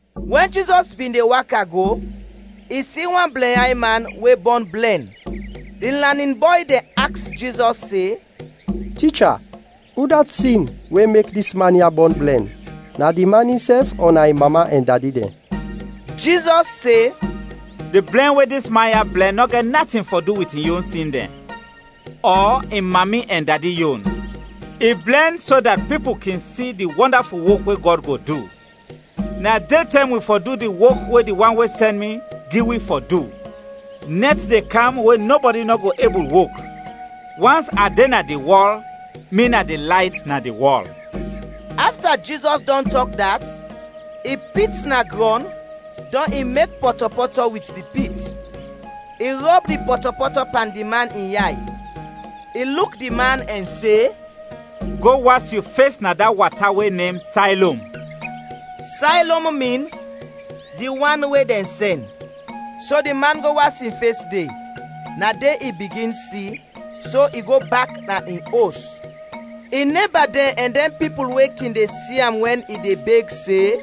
Wɛn Jizɔs bin de waka go, i si wan blɛnyay man, we bɔn blɛn. Di lanin bɔy dɛn aks Jizɔs se, “Ticha, udat sin we mek dis man ya bɔn blɛn? Na di man insɛf ɔ na in mami ɛn dadi dɛn?” Jizɔs se, “Di blɛn we dis man ya blɛn nɔ gɛt natin fɔ du wit in yon sin dɛn, ɔ in mami ɛn dadi yon. I blɛn so dat pipul kin si di wɔndaful wok we Gɔd go du. Na detɛm wi fɔ du di wok we di wan we sɛn mi gi wi fɔ du, nɛt de kam we nɔbɔdi nɔ go ebul wok. Wans a de na di wɔl, mi na di layt na di wɔl.” Afta Jizɔs dɔn tɔk dat, i pit na grɔn, dɔn i mek pɔtɔpɔtɔ wit di pit. I rɔb di pɔtɔpɔtɔ pan di man in yay. I luk di man ɛn se, “Go was yu fes na da wata we nem Saylom.” (“Saylom” min “Di wan we dɛn sɛn.”) So di man go was in fes de, na de i bigin si, so i go bak na in os. In neba dɛn ɛn dɛn pipul we kin de si am wɛn i de beg, se,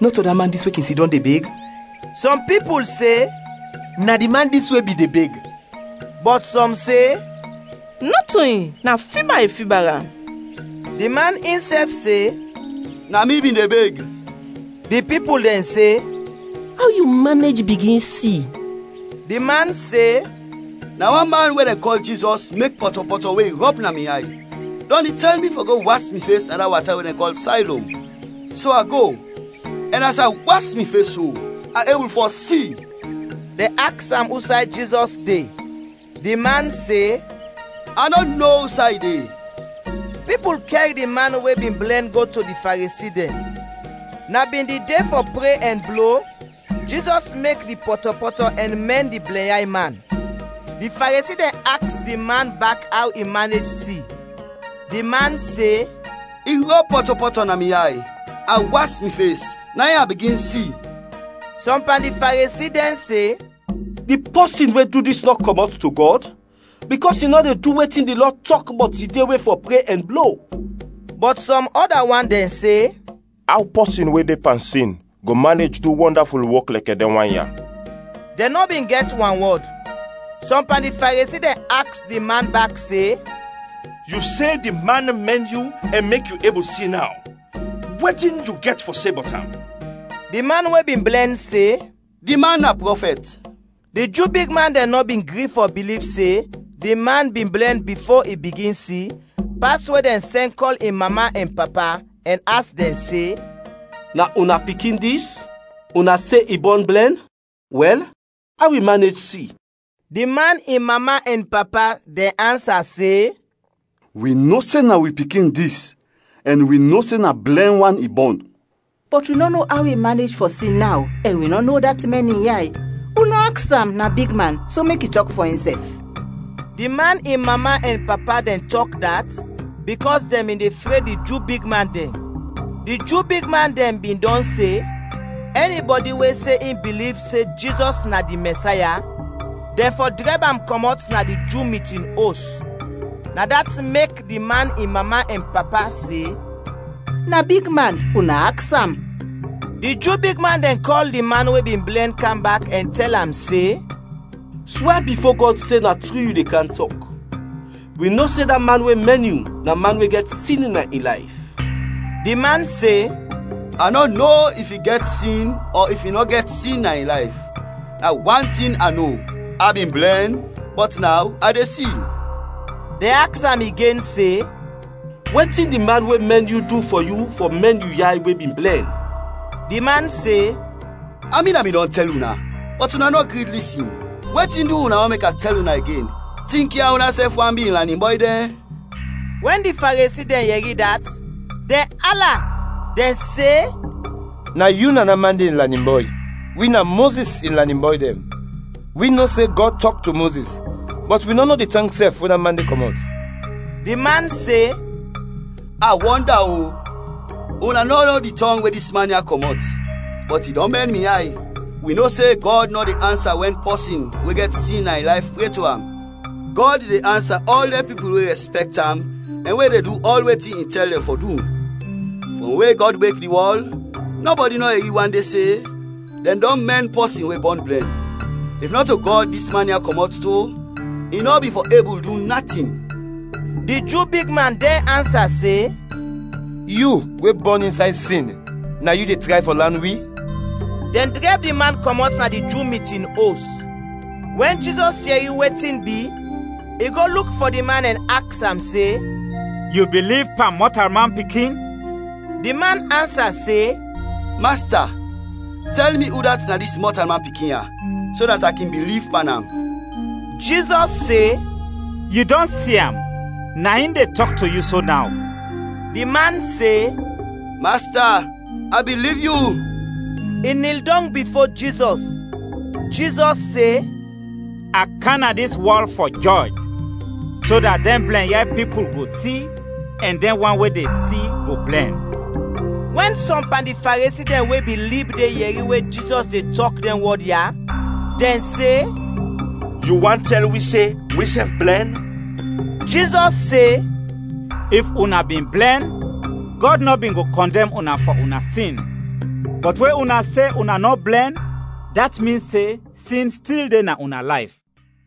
“Nɔto da man dis we kin sidɔm de beg?” Sɔm pipul se, “Na di man dis we bin de beg,” bɔt sɔm se, “Nɔto in, na fiba i fiba am.” Di man insɛf se, “Na mi bin de beg.” Di pipul dɛn se, “Aw yu manej bigin si?” Di man se, “Na wan man we dɛn kɔl Jizɔs mek pɔtɔpɔtɔ we i rɔb na mi yay, dɔn i tɛl mi fɔ go was mi fes na da wata we dɛn kɔl Saylom. So a go, ɛn as a was mi fes so, a ebul fɔ si.” Dɛn aks am usay Jizɔs de. Di man se, “A nɔ no usay i de.” Pipul kɛr di man we bin blɛn go to di Faresi dɛn. Na bin di de fɔ pre ɛn blo Jizɔs mek di pɔtɔpɔtɔ ɛn mɛn di blɛnyay man. Di Faresi dɛn aks di man bak aw i manej si. Di man se, “I rɔb pɔtɔpɔtɔ na mi yay, a was mi fes, na in a bigin si.” Sɔm pan di Faresi dɛn se, “Di pɔsin we du dis nɔ kɔmɔt to Gɔd, bikɔs i nɔ de du wetin di lɔ tɔk bɔt di de we fɔ pre ɛn blo.” Bɔt sɔm ɔda wan dɛn se, “Aw pɔsin we de pan sin go manej du wɔndaful wok lɛkɛ dɛn wan ya?” Dɛn nɔ bin gɛt wanwɔd. Sɔm pan di Faresi dɛn aks di man bak se, “Yu se di man mɛn yu ɛn mek yu ebul si naw. Wetin yu gɛt fɔ se bɔt am?” Di man we bin blɛn se, “Di man na prɔfɛt.” Di Ju bigman dɛn nɔ bin gri fɔ biliv se di man bin blɛn bifo i bigin si, pas we dɛn sɛn kɔl in mama ɛn papa, ɛn aks dɛn se, “Na una pikin dis? Una se i bɔn blɛn? Wɛl, aw i manej si?” Di man in mama ɛn papa dɛn ansa se, “Wi no se na wi pikin dis, ɛn wi no se na blɛn wan i bɔn. Bɔt wi nɔ no aw i manej fɔ si naw, ɛn wi nɔ no udat mɛn in yay. Una aks am, na bigman, so mek i tɔk fɔ insɛf!” Di man in mama ɛn papa dɛn tɔk dat bikɔs dɛn bin de fred di Ju bigman dɛn. Di Ju bigman dɛn bin dɔn se, ɛnibɔdi we se in biliv se Jizɔs na di Mɛsaya, dɛn fɔ drɛb am kɔmɔt na di Ju mitin os. Na dat mek di man in mama ɛn papa se, “Na bigman, una aks am!” Di Ju bigman dɛn kɔl di man we bin blɛn kam bak, ɛn tɛl am se, “Swɛ bifo Gɔd se na tru yu de kam tɔk! Wi no se da man we mɛn yu, na man we gɛt sin na in layf.” Di man se, “A nɔ no if i gɛt sin ɔ if i nɔ gɛt sin na in layf. Na wan tin a no, a bin blɛn, bɔt naw a de si.” Dɛn aks am igen se, “Wetin di man we mɛn yu du fɔ yu fɔ mɛn yu yay we bin blɛn?” Di man se, “A min a bin dɔn tɛl una, bɔt una nɔ gri lisin. Wetin du una want mek a tɛl una igen? Tinkya unasɛf want bi in lanin bɔy dɛn?” Wɛn di Faresi dɛn yɛri dat, dɛn ala. Dɛn se, “Na yu na da man de in lanin bɔy; wi na Mozis in lanin bɔy dɛn. Wi no se Gɔd tɔk to Mozis, bɔt wi nɔ no di tɔng sɛf we da man de kɔmɔt.” Di man se, “A wɔnda-o! Una nɔ no di tɔng we dis man ya kɔmɔt, bɔt i dɔn mɛn mi yay. Wi no se Gɔd nɔ de ansa wɛn pɔsin we gɛt sin na in layf pre to am. Gɔd de ansa ɔl dɛn pipul we rɛspɛkt am ɛn we de du ɔl wetin i tɛl dɛn fɔ du. Frɔm we Gɔd mek di wɔl, nɔbɔdi nɔ yɛri wande se, dɛn dɔn mɛn pɔsin we bɔn blɛn. If nɔto Gɔd dis man ya kɔmɔt to, i nɔ bin fɔ ebul du natin.” Di Ju bigman dɛn ansa se, “Yu we bɔn insay sin, na yu de tray fɔ lan wi?” Dɛn drɛb di man kɔmɔt na di Ju mitin os. Wɛn Jizɔs yɛri wetin bi, i go luk fɔ di man ɛn aks am se, “Yu biliv pan Mɔtalman Pikin?” Di man ansa se, “Masta, tɛl mi udat na dis Mɔtalman Pikin ya, so dat a kin biliv pan am!” Jizɔs se, “Yu dɔn si am, na in de tɔk to yu so naw.” Di man se, “Masta, a biliv yu!” I nil dɔng bifo Jizɔs. Jizɔs se, “A kam na dis wɔl fɔ jɔj, so dat dɛn blɛnyay pipul go si ɛn dɛn wan we de si go blɛn.” Wɛn sɔm pan di Faresi dɛn we bin lib de yɛri we Jizɔs de tɔk dɛn wɔd ya, dɛn se, “Yu want tɛl wi se wisɛf blɛn?” Jizɔs se, “If una bin blɛn, Gɔd nɔ bin go kɔndɛm una fɔ una sin, bɔt we una se una nɔ blɛn, dat min se sin stil de na una layf.”